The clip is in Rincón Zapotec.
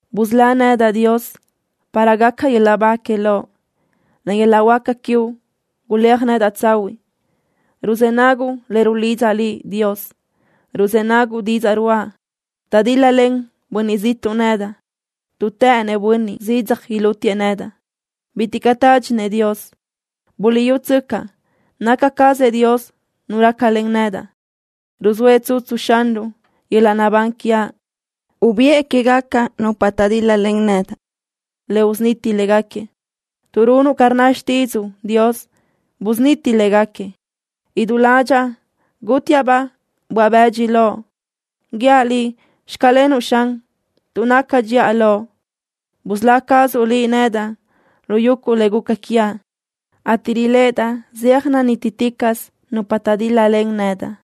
Busölá nedaʼ, Dios, para gaca yöl-laʼ ba que Loʼ. Len yöl-laʼ huáca quiuʼ guléaj nedaʼ tsahuiʼ. Ruzë́ naguʼ le rulidzaʼ Liʼ, Dios. Ruzë́ naguʼ didzaʼ ruáʼa. Taʼdíl-lalen bönniʼ ziʼtuʼ nedaʼ, tuʼ të́ʼënëʼ bönniʼ zidzaj ilútiëʼ nedaʼ. Bitiʼ caʼ tádxinëʼ Dios. Buliʼyútsöcaʼ, naca cazëʼ Dios Nu rácalen nedaʼ. Ruzóëʼ tsutsu Xanruʼ yöl-laʼ naʼbán quiaʼ. Ubiʼë quégaca nupa taʼdíl-lalen nedaʼ le usuniti léguequi. Tuʼ runuʼ ca rnna xtídzuʼu, Dios, busuniti léguequi. Idú ládxaʼa gútiaʼ-baʼ böaʼ-bëdxi loʼ. Guíaʼ Liʼ: “Xclenuʼ” Xan, tuʼ naca dxiʼa Loʼ. Busölá cazuʼ Liʼ nedaʼ lu yuguʼ le guca quiaʼ, ateʼ riléʼedaʼ zeaj nanítiticaʼsö nupa taʼdíl-lalen nedaʼ.